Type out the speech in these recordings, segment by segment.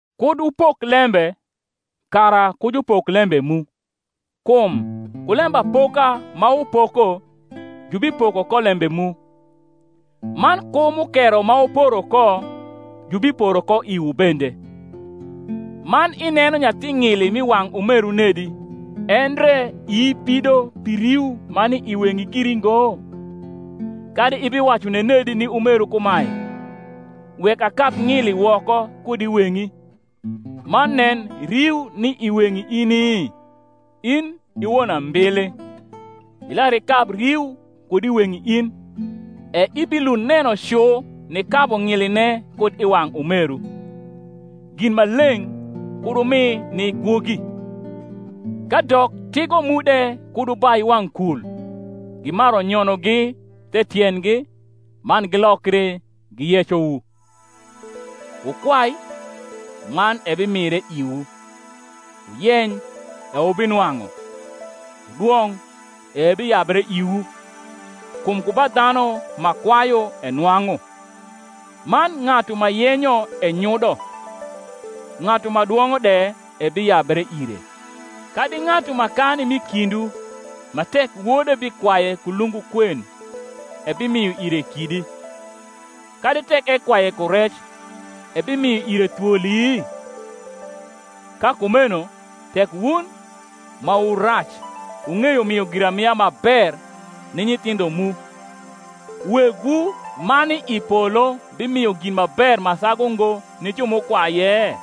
Kud wupok lembe, kara ku jupok lembe mu. Kum ku lembapoka ma wupoko, jubipoko ko lembe mu: man ku mukero ma wuporo ko, jubiporo ko iwu bende. Man ineno nyathi ng’ili m’i wang’ umeru nedi, endre ii pido pi riu ma ni i weng’i giri ngo? Kadi ibiwacu nenedi ni umeru kumae, Wek akab ng’ili woko kud i weng’i; man nen, riu ni i weng’i ini? In i won ambili, ilar ikab riu kud i weng’i in; e ibilund neno cu nikabu ng’iline kud i wang’ umeru. Gin ma leng’ kud wumi ni gwogi, kadok tigo mu de kud wubai wang’ kul, gimaru nyonogi the tiendgi, man gilokri giyecowu. Wukwai, man ebimire iwu; wuyeny, e wubinwang’u; wudwong’, e ebiyabre iwu: kum ku ba dhanu ma kwayu enwang’u; man ng’atu ma yenyo enyudo; ng’atu ma dwong’o de ebiyabre ire. Kadi ng’atu ma kani m’i kindwu, ma, tek wode bikwaye ku lungu kwen, ebimio ire kidi: kadi tek ekwaye ku rec, ebimio ire thwoli? Ka kumeno tek wun, ma wu rac, wung’eyo mio giramia ma ber ni nyithindho mu, Wegwu ma ni i polo bimio gin ma ber ma sagu ngo ni ju m’ukwaye?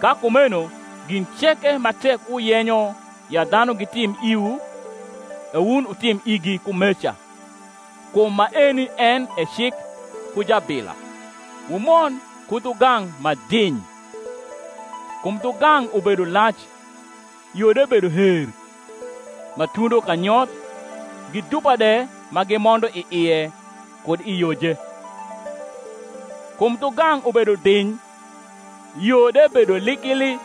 Ka kumeno gin ceke ma tek wuyenyo ya dhanu gitim iwu, e wun wutim igi kumeca: kum maeni en e cik ku jabila. Wumond ku dhugang’ ma diny: kum dhugang’ ubedo lac, yo de bedo her, ma tundo kanyoth, gi dupa de ma gimondo i ie kud i yoje. Kum dhugang’ ubedo diny, yo de bedo likili,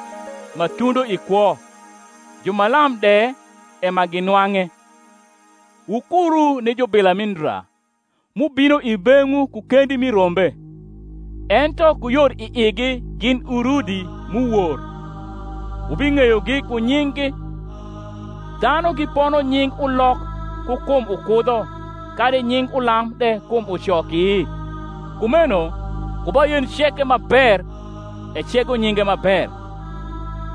ma tundo i kwo, ju ma lam de e ma ginwang’e. Wukuru ni jubila mi ndra, m’ubino i beng’wu ku kendi mi rombe, ento ku yor i igi gin urndi m’uwor. Wubing’eyogi ku nying’gi. Dhanu gipono nying ulok ku kum ukudho, kadi nying ulam de kum ucoki? Kumeno ku ba yen ceke ma ber ecego nyinge ma ber;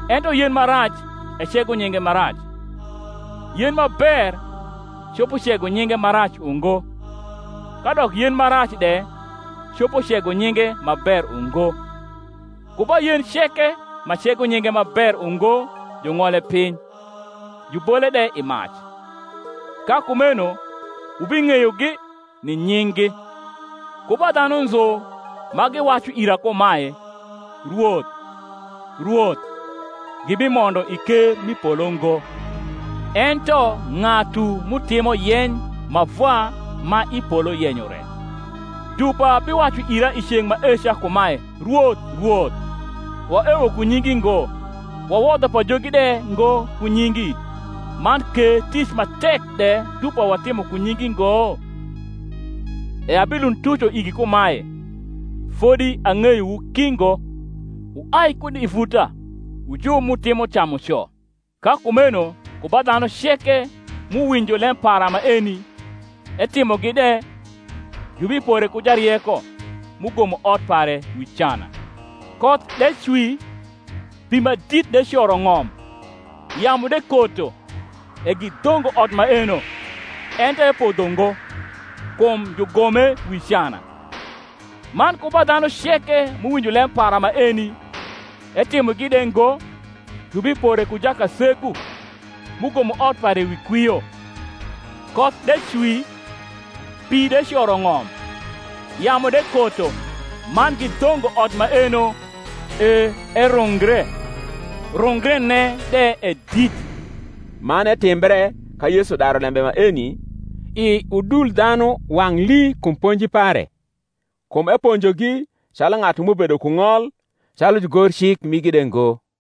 ento yen ma rac ecego nyinge ma rac. Yen ma ber copo cego nyinge ma rac ungo, kadok yen ma rac de copo cego nyinge ma ber ungo. Ku ba yen ceke ma cego nyinge ma ber ungo jung’ole piny, jubole de i mac. Ka kumeno wubing’eyogi ni nying’gi. Ku ba dhanu nzu ma giwacu ira kumae, Rwoth, Rwoth, gibimondo i ker m’i polo ngo; ento ng’atu m’utimo yeny ma Vwa ma i polo yenyo re. Dupa biwacu ira i ceng’ maeca kumae, Rwoth, Rwoth, waewo ku nyingi ngo, wawodho pajogi de ngo ku nyingi, man ke tic ma tek de dupa watimo ku nyingi ngo? E abilund tuco igi kumae, Fodi ang’eyowu ki ngo: wuai kud i vuta, wu ju m’utimo camuco. Ka kumeno ku ba dhanu ceke m’uwinjo lem para maeni, etimogi de, jubipore ku jarieko, m’ugomo ot pare wi cana: koth de cwi, pi ma dit de coro ng’om, yamu de koto, e gidhongo ot maeno; ento epodho ngo: kum jugome wi cana. Man ku ba dhanu ceke m’uwinjo lem para maeni, etimogi de ngo, jubipore ku jakasegu, m’ugomo ot pare wi kwio: koth de cwi, pi de coro ng’om, yamu de koto, man gidhongo ot maeno; e erungre: rungrene de e dit. Man etimbre ka Yesu daru lembe maeni, i udul dhanu wang’ lii kum ponji pare: kum eponjogi calu ng’atu m’ubedo ku ng’ol, calu jugorcik migi de ngo.